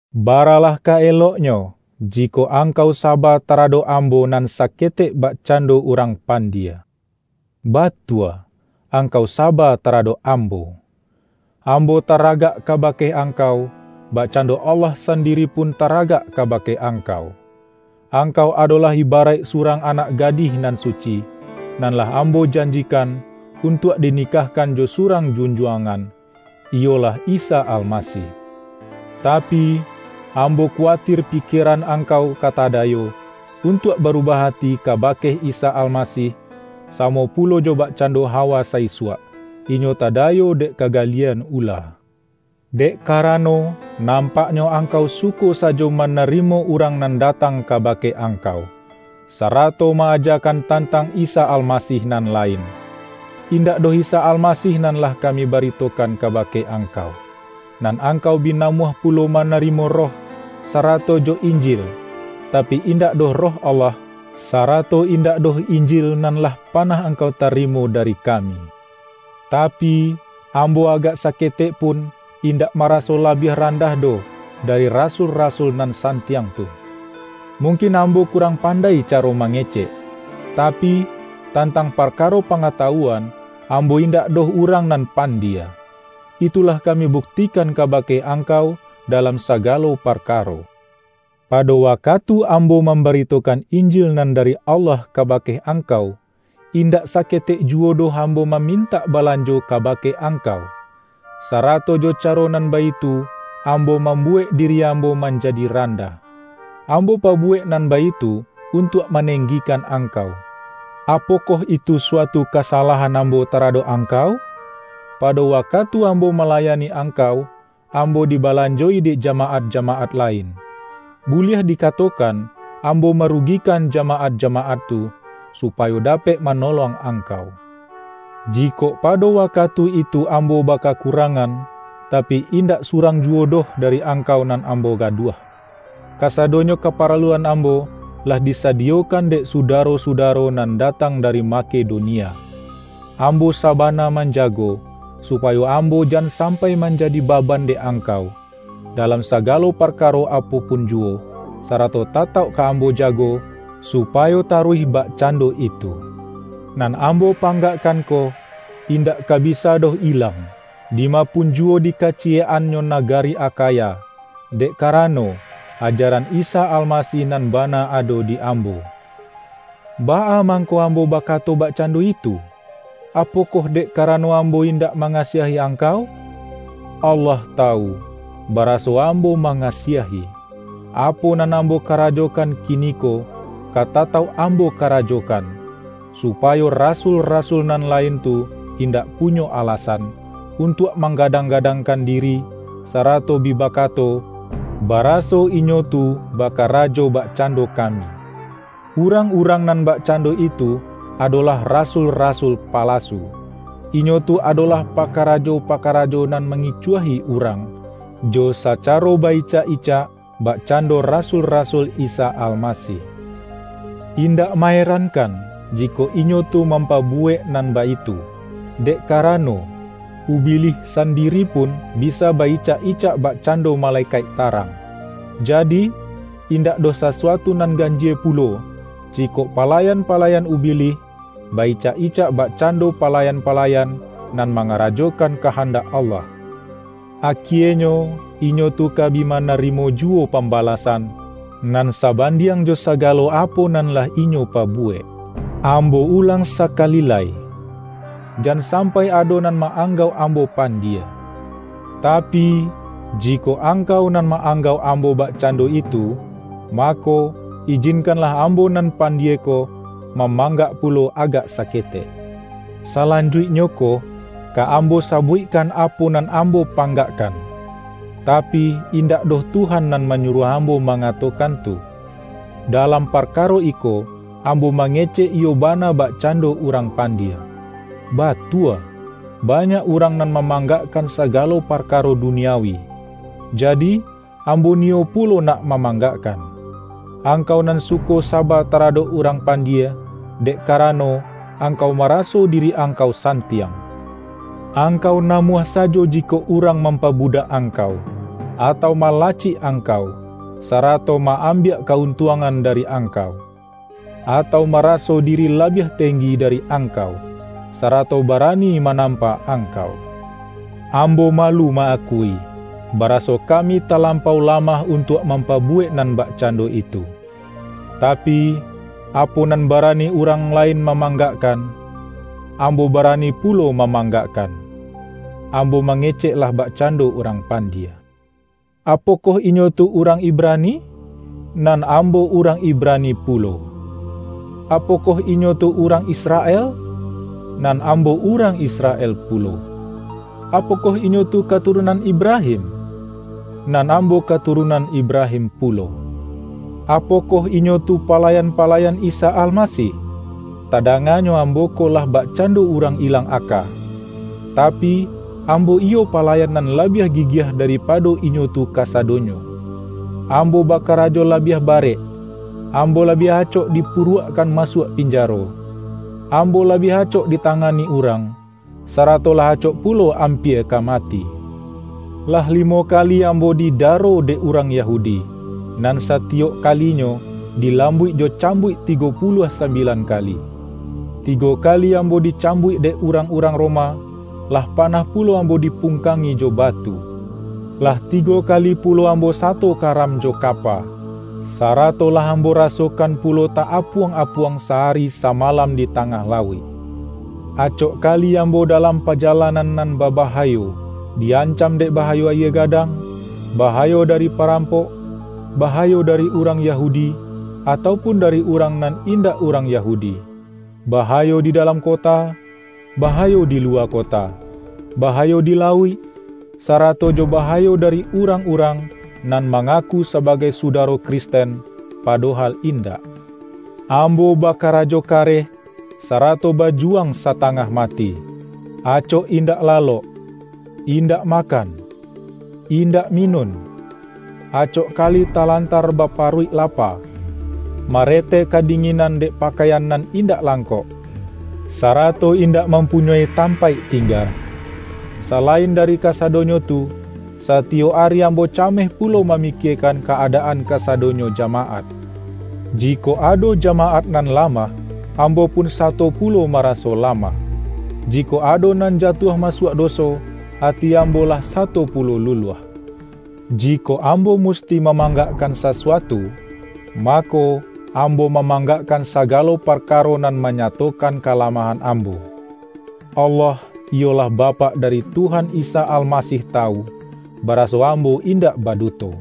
Baralah ka eloknyo, jikok ang-kau saba taradok ambo nan sa-ketek bakacando urang pandie. Batua, angkau saba taradok ambo! Ambo ta-ragak kabake angkau, bakcando Allah sandiri pun taragak kabake angkau. Angkau adolah ibaraik surang anak gadih nan suci, nan lah ambo janji-kan, untuak dinikahkan jo surang Junjuangan, iyolah Isa Almasih. Ta-pi, ambo kuwatir pikieran angkau ka tadayo, untuak barubah ati kabake Isa Almasih, samo pulo jo bakcando Ha-wa sa-isuak, inyo tadayo dek kagalie-an ula. Dek karano, nampaknyo ang-kau suko sajo manarimo urang nan datang kabake angkau, sarato ma-aja-kan tantang Isa Almasih nan lain, -indak doh Isa Almasih nan lah kami baritokan kabake angkau. Nan angkau bi namuah pulo manarimo roh, sarato jo”injil,” tapi, indak doh Roh Allah, sarato indak doh Injil nan lah panah angkau tarimo dari kami. Tapi, ambo agak saketek pun indak maraso labiah randah doh, dari”ra-sul-rasul" nan santiang tu! Mungkin ambo kurang pandai caro mangecek, tapi, tantang parkaro pangatawuan, ambo indak doh urang nan pandie. Itu lah kami buktikan kabake angkau da-lam sagalo parkaro. Pado wakatu ambo mambaritokan Injil nan dari Allah kabake angkau, in-dak saketek juwo doh ambo mamin-tak balanjo kabake angkau; sarato jo caro nan baitu ambo mambuwek di-ri ambo manjadi randah. Ambo pabu-wek nan baitu untuak manenggikan angkau. Apokoh itu suatu kasalahan ambo taradok angkau? Pado wa-katu ambo malayani angkau, ambo dibalanjo-i dek jamaat-jamaat lain. Buliah dikatokan ambo marugikan ja-maat-jamaat tu, supayo dapek mano-long angkau. Jikok pado wakatu itu ambo bakakurangan, tapi indak su-rang juwo doh dari angkau nan ambo gaduah. Kasadonyo kaparaluan ambo lah disadiyokan dek sudaro-sudaro nan datang dari Makedonia. Ambo saba-na manjago, supayo ambo jan sampai manjadi baban dek angkau, dalam sa-galo parkaro apo pun juwo, sarato ta-tauk ka ambo jago, supayo taruih bak-cando itu. Nan ambo panggakkan ko, indak ka bisa doh ilang, dima pun juwo di kaciyek-annyo nagari Akha-ya, dek karano, ajaran Isa Almasih nan bana ado di ambo. Baa mangko ambo bakato bakcando itu? Apokoh dek karano ambo indak mangasiahi angkau? Allah tawu, baraso ambo ma-ngasiahi! Apo nan ambo karajokan kiniko, ka tatauk ambo karajokan, supayo”rasul-rasul" nan lain tu indak punyo alasan, untuak manggadang-gadangkan diri, sa-rato bi bakato, baraso inyo tu bakarajo bakcando kami. Urang-urang nan bak-cando itu adolah rasul-rasul palasu. Inyo tu adolah pakarajo-pakarajo nan mangi-cuahi urang, jo sacaro ba-icak-icak bak-cando rasul-rasul Isa Almasih. Indak ma-erankan jikok inyo tu mampabu-wek nan baitu, dek karano, Ubilih san-diri pun bisa ba-icak-icak bakcando ma-lekaik tarang! Jadi, indak doh sasuatu nan ganjie pulo, jikok palayan-palayan Ubilih, ba-icak-icak bakcando palayan-palayan nan mangarajokan kahandak Allah. Akienyo, inyo tu ka bi manarimo juwo pambalasan, nan sabandiang jo sa-galo apo nan lah inyo pabuwek. Ambo ulang sakali lai: Jan sampai ado nan ma-anggauk ambo pandie. Tapi, jikok angkau nan ma-anggauk ambo bakcando itu, mako, ijinkanlah ambo nan pandie ko, mamanggak pulo agak saketek. Salanjuiknyo ko, ka ambo sabuikkan apo nan ambo panggak-kan, tapi, indak doh Tuhan nan ma-nyuruah ambo mangatokan tu. Dalam parkaro iko, ambo mangecek iyo bana bakcando urang pandie. Batua, ba-nyak urang nan mamanggakkan saga-lo parkaro duniawi, jadi, ambo niyo pulo nak mamanggakkan. Angkau nan suko saba taradok urang pandie, dek karano, angkau maraso diri ang-kau santiang! Angkau namuah sa-jo jikok urang mampabudak angkau, atau malacik angkau, sarato ma-am-biak ka-untuangan dari angkau, atau maraso diri labiah tenggi dari ang-kau, sarato barani manampa angkau. Ambo malu ma-akui, baraso kami talampau lamah untuak mampabu-wek nan bakcando itu. Tapi, apo nan barani urang lain ma-manggakkan, ambo barani pulo ma-manggakkan! (Ambo mangecek lah bakcando urang pandie.) Apokoh inyo tu urang Ibrani? Nan ambo urang Ibrani pulo. Apokoh inyo tu urang Israel? Nan ambo urang Israel pulo. Apokoh inyo tu katurunan Ibrahim? Nan ambo katurunan Ibrahim pulo! Apokoh inyo tu palayan-palayan Isa Almasih? Tadanganyo ambo ko lah bakcando urang ilang aka, tapi, ambo iyo palayan nan labiah gigiah daripa-do inyo tu kasadonyo! Ambo bakarajo labiah barek, ambo labiah acok dipu-ruakkan masuak pinjaro, ambo labiah acok ditangani urang, sarato lah acok pulo ampia ka mati. Lah limo kali ambo didaro dek urang Yahudi, nan satiyok kalinyo, dilambuik jo cambuik tigo puluah sambilan kali. Tigo ka-li ambo dicambuik dek urang-urang Roma; lah panah pulo ambo dipung-kangi jo batu. Lah tigo kali pulo ambo sato karam jo kapa, sarato lah ambo rasokan pulo ta-apuang-apuang sa-ari samalam di tangah lauik. Acok ka-li ambo dalam pajalanan nan babaha-yo: di-ancam dek bahayo ayie gadang, bahayo dari parampok, bahayo dari urang Yahudi, atau pun dari urang nan indak urang Yahudi, bahayo di dalam kota, bahayo di luwa kota, ba-hayo di lauik, sarato jo bahayo dari urang-urang, nan mangaku sabagai su-daro Kristen, padohal indak. Ambo bakarajo kareh, sarato bajuwang sa-tangah mati: acok indak lalok, indak makan, indak minun, acok kali talan-tar baparuik lapa, marete kadinginan dek pakaian nan indak langkok, sa-rato indak mampunyoi tampaik ting-ga. Salain dari kasadonyo tu, sati-yok ari ambo cameh pulo mamikiekan ka-adaan kasadonyo jamaat. Jikok ado jamaat nan lamah, ambo pun sa-to pulo maraso lamah. Jikok ado nan jatuah masuak doso, ati ambo lah sa-to pulo luluah. Jikok ambo musti mamanggak-kan sasuatu, mako, ambo mamang-gakkan sagalo parkaro nan manyato-kan kalamahan ambo. Allah, iyolah Bapak dari Tuhan Isa Almasih tawu, baraso ambo indak baduto.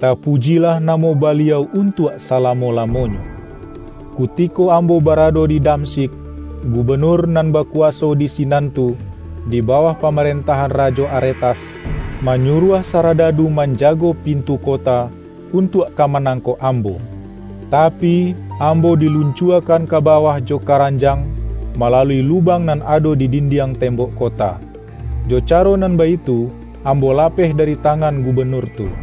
Tapujilah namo Baliau untuak salamo-lamonyo. Kutiko ambo barado di Damsyik, gubenur nan bakuwaso di sinan tu, di bawah pamarentahan Rajo Aretas, manyuruah saradadu manjago pin-tu kota, untuak ka manangkok am-bo. Tapi, ambo diluncuakan ka ba-wah jo karanjang, malalui lubang nan ado di dindiang tembok kota. Jo ca-ro nan baitu ambo lapeh dari tangan gubenur tu.